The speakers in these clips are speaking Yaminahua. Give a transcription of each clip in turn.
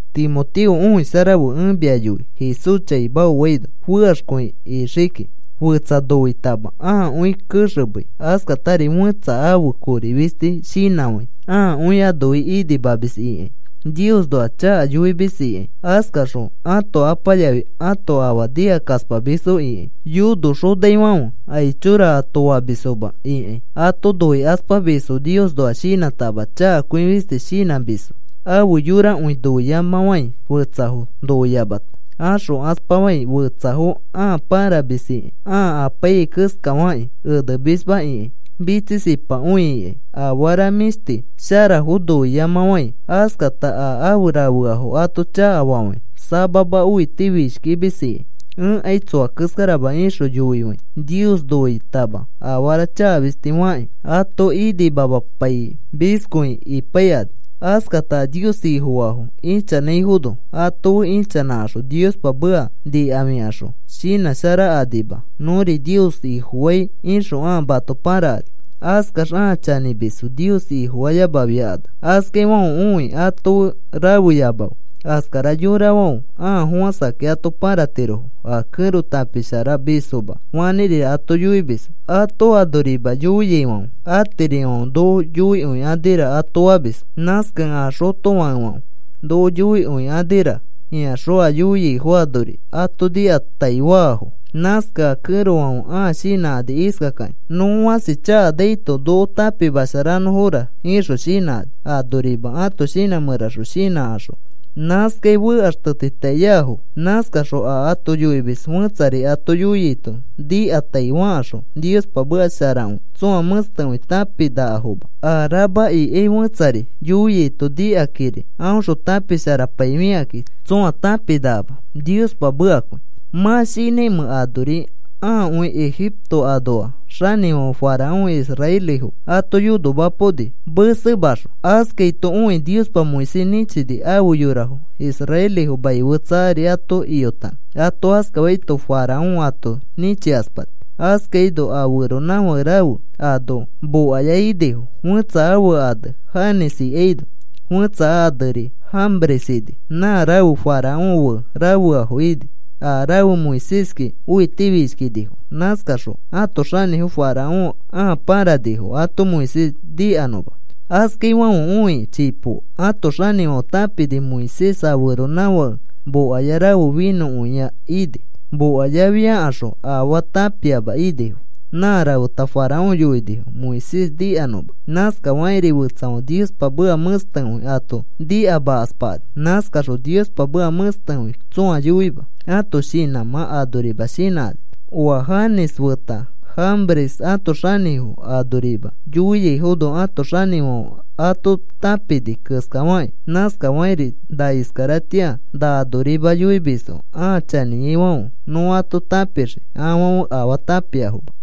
Timoteo, õisharafe. Ẽ mia yoi Jesús chaima oaino fekaxkõi ixii kiki. Fetsa noitama ãakõi kexemei, askatari fẽtsa ãfe kori fisti shinãfãi, ãakõi anofi inimamis ikãi, Niosnoa chaka yoimis ikãi, askaxõ ãto apa yafi ãto afa nikakaspamisfo ikãi, yonoxofiaifãfe aichora ato famisfoma ikãi, ato noikaspamisfo, Niosnoa shinãtama chakakõi fistis shinãmisfo, afe yorakõi noiyamafãi, fetsafo noiyamata axokaspafãi, fetsafo ãa pãramis ikãi, ãa apaiyai keskafakĩ enemisma ikãi, mitsisipakõi ikãi, afara mĩshti sharafo noiyamafãi, askata a afe rafeafo ato chakafafãi, samama õitifishkimis ikãi, “Ẽkai tsoa keskarama,” ixõ yoifãi, Nios noitama afara chaka fisti fakĩ ato inimamapaimiskõi ipaikani. Askata a Nios Ifofaafo ichanãifono ato fe ichanãkaxõ Niospa meka nikafikaxõ shinãsharakanima. “Nõri Nios Ifofai,” ixõ ãa mato pãrakani. Askax ãa chanĩmisfo Nios Ifofayamafiakanax. Askaifãfe õi ato fe rafeyamafe. Askara yorafãfe a fofãsakakĩ ato pãratirofo a kẽro tãpisharamisfoma fanĩrira ato yoimisfo ato anorima yoiaifãfe. Atirifãfe noko yoikõikanira ato famisfo. Nãskakẽ a xotofakefãfe noko yoikõikanira ikaxõ a yoiaifo anori ato nikataifaafo. Nãskakẽ a kẽrofãfe ãa shinãkani iskakakĩ: “Nõ fãsi chakakakainaito, noko tãpimasharanõfora,” ixõ shinãkani anorima ãto shinã mẽraxõ shinãkaxõ nãskai fekaxtetitaiafo. Nãskaxõ a ato yoimis fẽtsari ato yoiaito, nikatai fakaxõ Niospa meka sharakõi tsõa mẽstekõi tãpinakafoma. A rama ikai fẽtsari yoiaito, nikakãkiri aõxõ tãpisharapaifikakĩ, tsõa tãpinakama Niospa mekakõi. ¿Mã mĩ shinãimẽ anori aakõi Egipto anoa xanĩfãfe Faraón israelifo ato yonomapaoni, mesemaxõ? Askaito õikĩ Niospa Moisés nĩchini afe yorafo israelifo mai fetsa ari ato iyotanõ. Ato askafaito Faraón ato nĩchikaspani. Askaino a feronãfake rafe ano mokaya inifo; fẽtsa ane Janes ikaino fẽtsa aneri Jambres ini, nã rafe Faraón fe rafeafo ini. A rafe Moiséski õitifishkinifo. Nãskaxõ ãto xanĩfo Faraón ãa pãranifo ato Moisés nikanõma. Askafaifãfe õikĩ chipo ãto xanĩfãfe tãpini Moisés a feronãfake mokaya rafe finõkõia ini. Mokayafiakaxõ afaa tãpiama inifo. Nã rafeta Faraón yoinifo Moisés nikanõma. Nãskafakĩri fetsafãfe Niospa meka mẽstekõi ato nikamakaspakani. Nãskakaxõ Niospa meka mẽstekõi tsõa yoima ãto shinãmã anorima shinãkani. Oa Janes feta Jambres ãto xanĩfo anorima yoiaifono ãto xanĩfãfe ato tãpini keskafakĩ. Nãskafakĩri na iskaratĩa na anorima yoimisfo ãa chanĩaifãfe nõ ato tãpixii afãfe afaa tãpiafoma.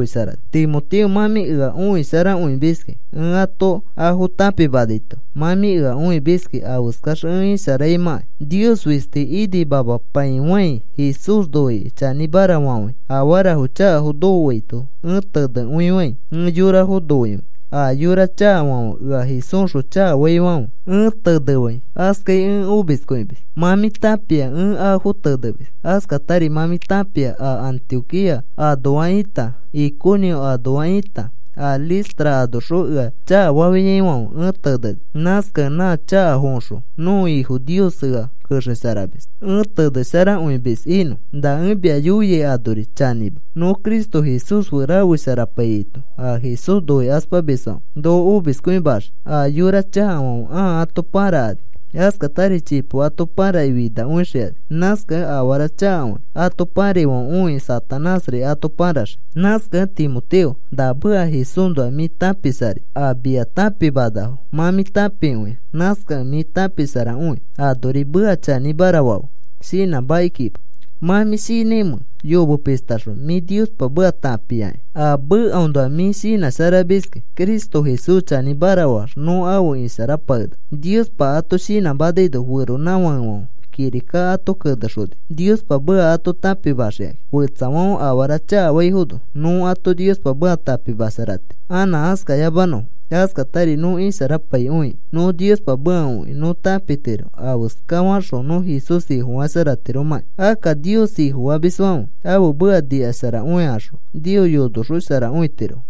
Timoteo, mã mĩ ea õisharakõimiskĩ ẽ ato afo tãpimanaito. Mã mĩ ea õimiskĩ afeskax ẽ isharaimãkai, Nios fisti inimamapaifãi, Jesús noikĩ chanĩmara fafãi, afarafo chakafo nokoaito ẽ tenefãi, ẽ yorafo noifãi, a yora chakafãfe ea Jesúsxõ chakafaifãfe ẽ tenefãi, askai ẽ omiskõimis. Mã mĩ tãpia ẽ afo tenemis. Askatari mã mĩ tãpia a Antioquía anoa ita, Iconio anoa ita, a Listra anoxõ ea chakafafiaifãfe ẽ teneni. Nãskakẽ nã chakafoõxõ nõko Ifo Nios ea kexesharamis ẽ tenesharakõimis inõ. Na ẽ mia yoiai anori chanĩma. Nõ Cristo Jesús fe rafesharapaiyaito a Jesús noikaspamisfãfe noko omiskõimaxii. A yora chakafãfe ãa ato pãrakani. Askatari chipo ato pãrakĩ finakõixikani. Nãskakẽ afara chakafakĩ ato pãraifãfe õikĩ Satanásri ato pãraxii. Nãskakẽ Timoteo, na meka Jesúsnoa mĩ tãpisharai. A mia tãpimanafo mã mĩ tãpikõia. Nãskakẽ mĩ tãpisharakõi. Anori meka chanĩmara fafe, shinãmakikima. ¿Mã mĩ shinãimẽ yomepishtaxõ mĩ Niospa meka tãpiakĩ? A mekaõnoa mĩ shinãsharamiskĩ Cristo Jesús chanĩmara faax nõ afe isharapakenaka. Niospa ato shinãmanaino feronãfakefãfe kirika ato kenexonifo Niospa meka ato tãpimaxikakĩ. Fetsafãfe afara chakafaifono, nõ ato Niospa meka tãpimasharatiro anã askayamanõfo. Askatari nõ isharapaikõikĩ nõ Niospa meka õikĩ nõ tãpitiro afeska faxõ nõ Jesús Ifofasharatiromãkĩ. Akka Nios Ifofamisfãfe ãfe meka nikasharakõikaxõ, Nios yonoxosharakõitirofo.